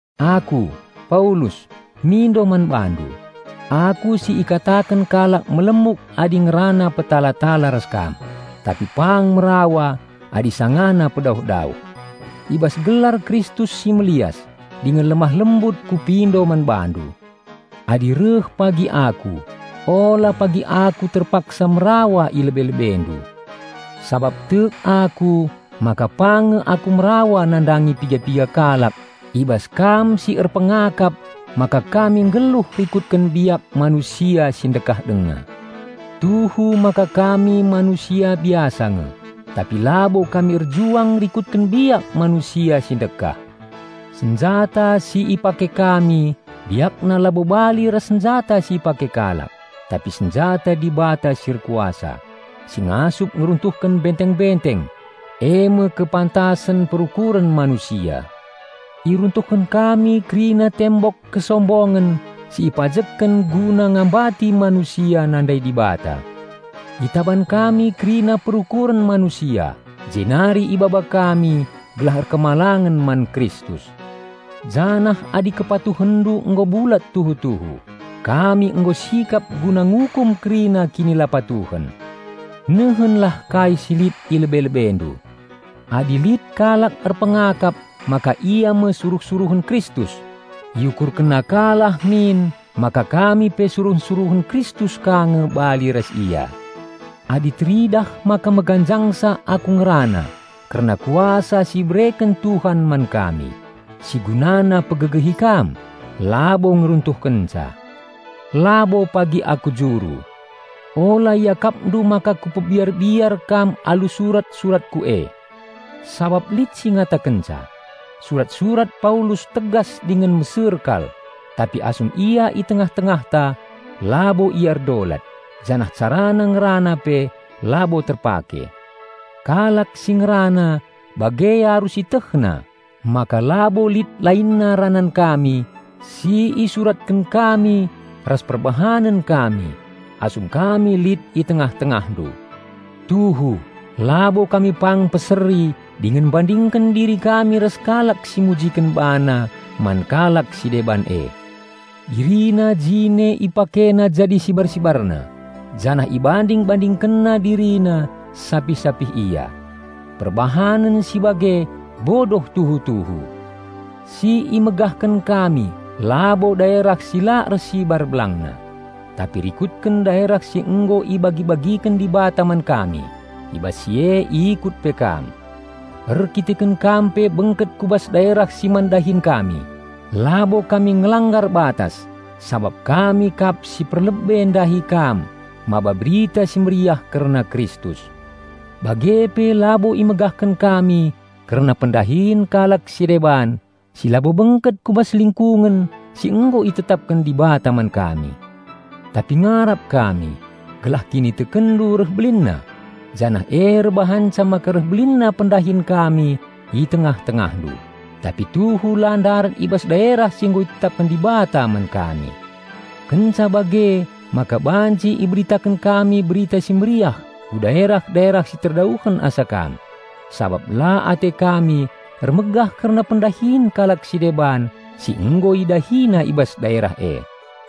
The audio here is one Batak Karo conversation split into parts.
Aku, Paulus, mindo man bandu, aku si ikataken kalak melemuk adi ngerana petala-tala ras kam, tapi pang merawa adi sangana pedauh-dauh. I bas gelar Kristus si melias dingen lemah lembut kupindo man bandu. Adi reh pagi aku, ula pagi aku terpaksa merawa i lebe-lebendu; sabap tek aku maka pang nge aku merawa nandangi piga-piga kalak i bas kam si erpengakap maka kami nggeluh rikutken biak manusia si ndekah denga. Tuhu maka kami manusia biasa nge, tapi labo kami erjuang rikutken biak manusia si ndekah. Senjata si ipake kami biakna labo bali ras senjata si ipake kalak, tapi senjata Dibata si erkuasa, si ngasup ngeruntuhken benteng-benteng, eme kepantasen perukuren manusia. Iruntuhken kami kerina tembok kesombongen si ipajekken guna ngambati manusia nandai Dibata. Itaban kami kerina perukuren manusia, jenari ibaba kami gelah patuh man Kristus. Janah adi kepatuhenndu nggo bulat tuhu-tuhu, kami nggo sikap guna ngukum kerina kinilapatuhen. Nehenlah kai si lit i lebe-lebendu. Adi lit kalak erpengakap maka ia me suruh-suruhen Kristus, iukurkenna ka lah min maka kami pe suruh-suruhen Kristus ka nge bali ras ia. Adi teridah maka meganjangsa aku ngerana kerna kuasa si ibereken Tuhan man kami -- si gunana pegegehi kam, labo ngeruntuhkenca -- labo pagi aku juru. Ula iakapndu maka kupebiar-biar kam alu surat-suratku e. Sabap lit si ngatakenca, "Surat-surat Paulus tegas dingen meser kal, tapi asum ia i tengah-tengahta, labo ia erdolat, janah carana ngerana pe labo terpake." Kalak si ngerana bage arus ietehna maka labo lit lainna ranan kami si isuratken kami ras perbahanen kami asum kami lit i tengah-tengahndu. Tuhu, labo kami pang mpeseri dingen mbandingken diri kami ras kalak si mujiken bana man kalak si deban e. Dirina jine ipakena jadi sibar-sibarna janah ibanding-bandingkenna dirina sapih-sapih ia. Perbahanen si bage bodoh tuhu-tuhu! Si imegahken kami labo daerah si la ersibar belangna, tapi rikutken daerah si nggo ibagi-bagiken Dibata man kami. I bas si e ikut pe kam. Erdandanken kam pe bengket ku bas daerah si man dahin kami, labo kami ngelanggar batas sabap kami kap si perlebe ndahi kam maba Berita Si Mehuli kerna Kristus. Bage pe labo imegahken kami kerna pendahin kalak si deban si labo bengket ku bas lingkungen si nggo itetapken Dibata man kami. Tapi ngarap kami gelah kinitekenndu reh belinna, janah e erbahanca maka reh belinna pendahin kami i tengah-tengahndu, tapi tuhu la ndarat i bas daerah si nggo itetapken Dibata man kami. Kenca bage maka banci iberitaken kami Berita Si Mehuli ku daerah-daerah si terdauhen asa kam, sabap la ate kami ermegah kerna pendahin kalak si deban si nggo idahina i bas daerah e.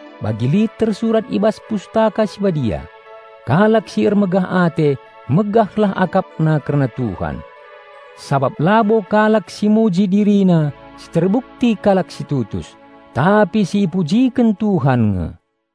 Bagi lit tersurat i bas Pustaka Si Badia, "Kalak si ermegah ate, megahlah akapna kerna Tuhan." Sabap labo kalak si muji dirina si terbukti kalak si tutus, tapi si ipujiken Tuhan nge.